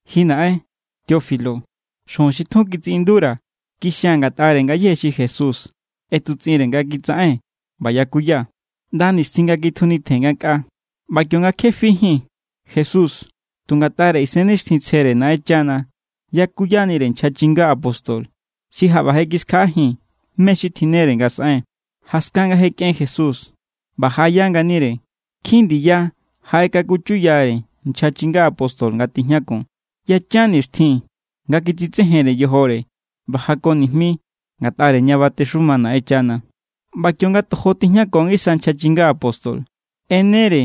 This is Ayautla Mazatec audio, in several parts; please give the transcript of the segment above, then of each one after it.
Ji naꞌen, Teófilo, xujun xi tjun kitsiꞌindura̱ kixia̱n ngatꞌare ngayéje xi Jesús ꞌetutsꞌinre nga kitsaꞌen ꞌba yakuya ꞌnda nixtjin nga kitjunitjen ngankꞌaa. ꞌBa kionga kje fijín, Jesús tu ngatꞌare Isennixtjintsjere Naꞌenchana yakuyanire nchja chinga apóstol xi jaꞌba je kiskjaꞌajin mé= xi tjinnere nga saꞌen. Jaskan nga je kꞌen Jesús ꞌba jaꞌaya nganire, nkjin ndiya jaꞌekakuchuyare nchja chinga apóstol nga tijñakun. Yachan nixtjin nga kitsitsejenre yojore ꞌba jako nijmi ngatꞌare ña batexuma Naꞌenchana. ꞌBa kionga tojo tijñako ngisa nchja chinga apóstol, ꞌenere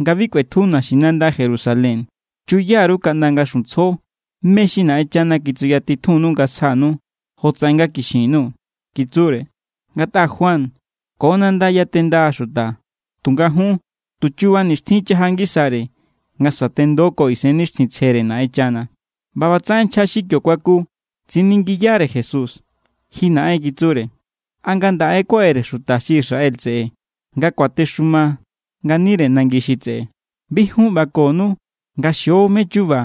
nga bi kꞌuetju naxinanda Jerusalén. —Chuya_ru kaꞌnda nga xuntsjo mé= xi Naꞌenchana kitsuyatitjunnu nga sjanu jotsaꞌen nga kixin_nuu̱ —kitsure—. Ngatꞌa Juan ko nanda yatenda xuta, tunga jun, tu chuba nixtjin= chaja ngisare nga sa̱tendo ko Isennixtjintsjere Naꞌenchana. ꞌBa ꞌbatsaꞌen nchja xi kio kuaku tsiningiyare Jesús: —Ji naꞌen —kitsure—, ¿a ngandaꞌe= kuaꞌere xuta xi Israel tseꞌe nga kuatexuma nganire nangi xi tseꞌe? —Bi jun ꞌbakonu nga xio mé= chuba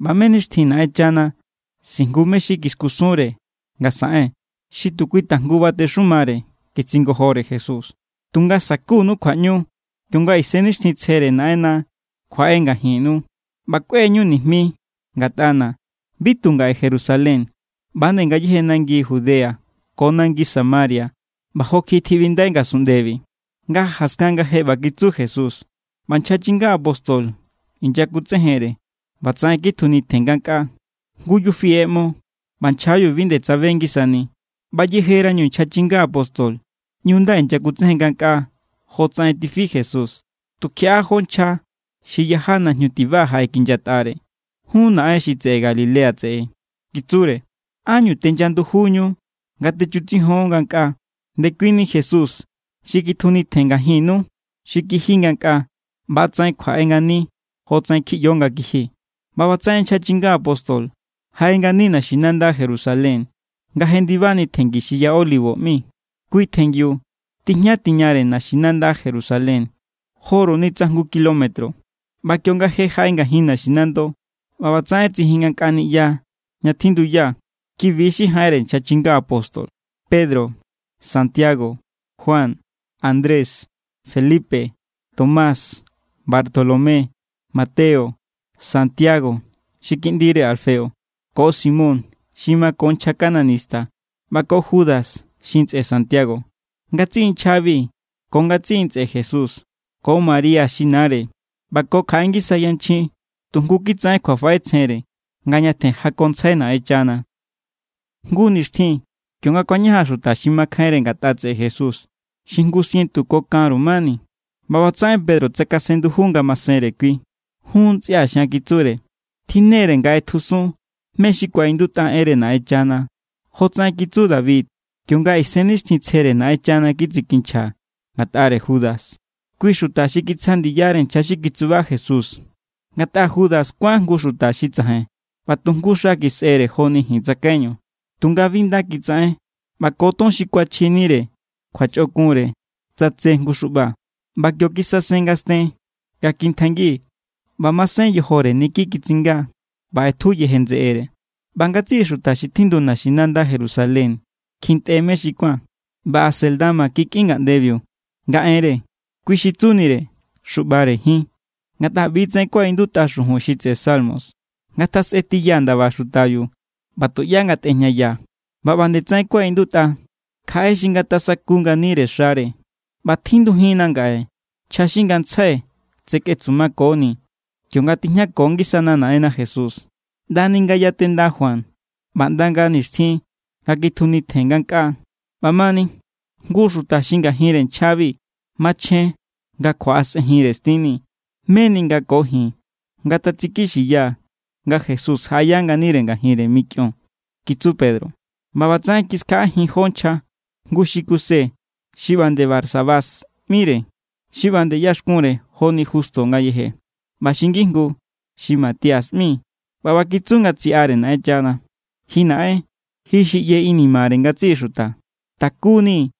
ꞌba mé= nixtjin Naꞌenchana sijngu mé= xi kiskusunre nga saꞌen, xi tu kui tajngu batexumare —kitsingojore Jesús—. Tunga sa̱kunu kjuaꞌñu kionga Isennixtjintsjere Naꞌenna kjuaꞌe ngajinnu, ꞌba kꞌue=ñu nijmi ngatꞌana̱ bi tu ngaꞌe Jerusalén ꞌba=nde ngayéje nangi Judea ko nangi Samaria ꞌba jo kjiꞌi tjiꞌbindai ngasunꞌndebi. Nga jaskan nga je ꞌba kitsu Jesús, ꞌba nchja chinga apóstol inyakutsejenre, ꞌbatsaꞌen kitjunitjen ngankꞌaa. Jngu yufi ꞌeꞌmo ꞌba nchjabiu bi nde tsabe ngisani. ꞌBa yejerañu nchja chinga apóstol ꞌñu nda inyakutsejen ngankꞌaa jotsaꞌen tifi Jesús, tukjiaꞌa jó nchja xi yaja najñu tiba jaꞌekinyatꞌare. —Jun, naꞌen xi Galilea tseꞌe —kitsure—, ¿ánñu tenya ndujunñu nga techutsijion ngankꞌaa? Ndekuini Jesús xi kitjunitjen ngajinnu xi kiji ngankꞌaa, ꞌba=tsaꞌen kjuaꞌe ngani jotsaꞌen kjiꞌyo nga kiji. ꞌBa ꞌbatsaꞌen nchja chinga apóstol jaꞌe ngani naxinanda Jerusalén nga jendibani tjenngi xi Ya Olivo ꞌmi. Kui tjenngiu tijña tiñare naxinanda Jerusalén joru ni tsa jngu kilómetro. ꞌBa kionga je jaꞌe ngajin naxinando, ꞌbatsaꞌen tsijin ngankꞌa niꞌya ña tjinduya. Kibi= xi jaꞌenre nchja chinga apóstol: Pedro, Santiago, Juan, Andrés, Felipe, Tomás, Bartolomé, Mateo, Santiago xi kiꞌndire Alfeo, ko Simón xi mako nchja cananista ꞌba ko Judas xi ntsꞌe Santiago. Ngatsiꞌi nchjabi ko ngatsiꞌi ntsꞌe Jesús, ko María xi nare ꞌba ko kjaꞌe ngisa yanchjin tu jngu= kitsaꞌen kjuafaꞌetsjenre nga ñatjen jakontsjai Naꞌenchana. Jngu nixtjin kionga kuañajan xuta xi makjainre ngatꞌa tseꞌe Jesús xi jngu sientu ko kanru mani, ꞌba ꞌbatsaꞌen Pedro tsakasen nduju ngamasenre kui. —Jun ntsꞌia̱ xian —kitsure—, tjinnere nga ꞌetjusun mé= xi kuaꞌindutꞌa enre Naꞌenchana jotsaꞌen kitsu David kionga Isennixtjintsjere Naꞌenchana kitsikinchja ngatꞌare Judas, kui xuta xi kitsja ndiyare nchja xi kitsuba Jesús. Ngatꞌa Judas kuán jngu xuta xi tsajain ꞌba tu jngu xa kisꞌere joni ji̱n tsakaiñu. Tunga bi nda kitsaꞌen, ꞌba ko ton xi kuachjinire kjuachꞌokunre tsatse jngu xuꞌba. ꞌBa kio kisasen ngasten nga kintjaingi ꞌba masen yojore niki kitsinga, ꞌba ꞌetju yeje ndseꞌere. ꞌBa ngatsiꞌi xuta xi tjindu naxinanda Jerusalén kjintꞌe mé xi kuán, ꞌba Alcédama kikꞌin ngaꞌndebiu nga enre. Kui xi tsunire: Xuꞌbare Jin. Ngatꞌa ꞌbitsaꞌen kuaꞌindutꞌa xujun xi tseꞌe Salmos: Ngatasꞌe tiya ndaba xutabiu, ꞌba tuꞌyá ngatꞌejñaya. ꞌBa ꞌba nde tsaꞌen kuaꞌindutꞌa: Kjaꞌe xi ngatasaku nganire xare. ’ꞌBa tjindujinna ngaꞌe nchja xi ngantsjai tseketsumakoni̱ kionga tijñako ngisana Naꞌenna Jesús, ꞌndani nga yatenda Juan ꞌba ꞌnda nga nixtjin nga kitjunitjen ngankꞌaa. ꞌBamani, jngu xuta xi ngajinre nchjabi machjen nga kjuaꞌasꞌenjinre stinni̱ meni nga ko ji̱n ngatatsikixiya nga Jesús jaꞌaya nganire ngajinre mikꞌion —kitsu Pedro. ꞌBa ꞌbatsaꞌen kiskjaꞌajin jó nchja, jngu xi Kuse xi ꞌba nde Barsabás ꞌmire xi ꞌba nde ꞌyaxkunre joni Justo ngayeje, ꞌba xi ngijngu xi Matías ꞌmi. ꞌBa ꞌba kitsu nga tsiꞌare Naꞌenchana: —Ji Naꞌen, ji xi ꞌye inimare ngatsiꞌi xuta. Takunii̱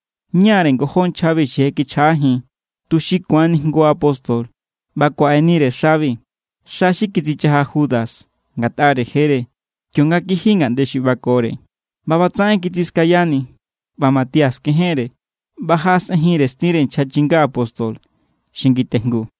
ñáre ngojó nchjabi xi je kichjaꞌajin, tuxi ku̱anni jngu apóstol ꞌba kuaꞌenire xabi, xa xi kitsichaja Judas ngatꞌare jere, kionga kiji ngaꞌnde xi ꞌbakore. ꞌBa ꞌbatsaꞌen kitsiskayani, ꞌba Matías kejenre, ꞌba jaꞌasꞌenjinre stinre nchja chinga apóstol xi ngitejngu.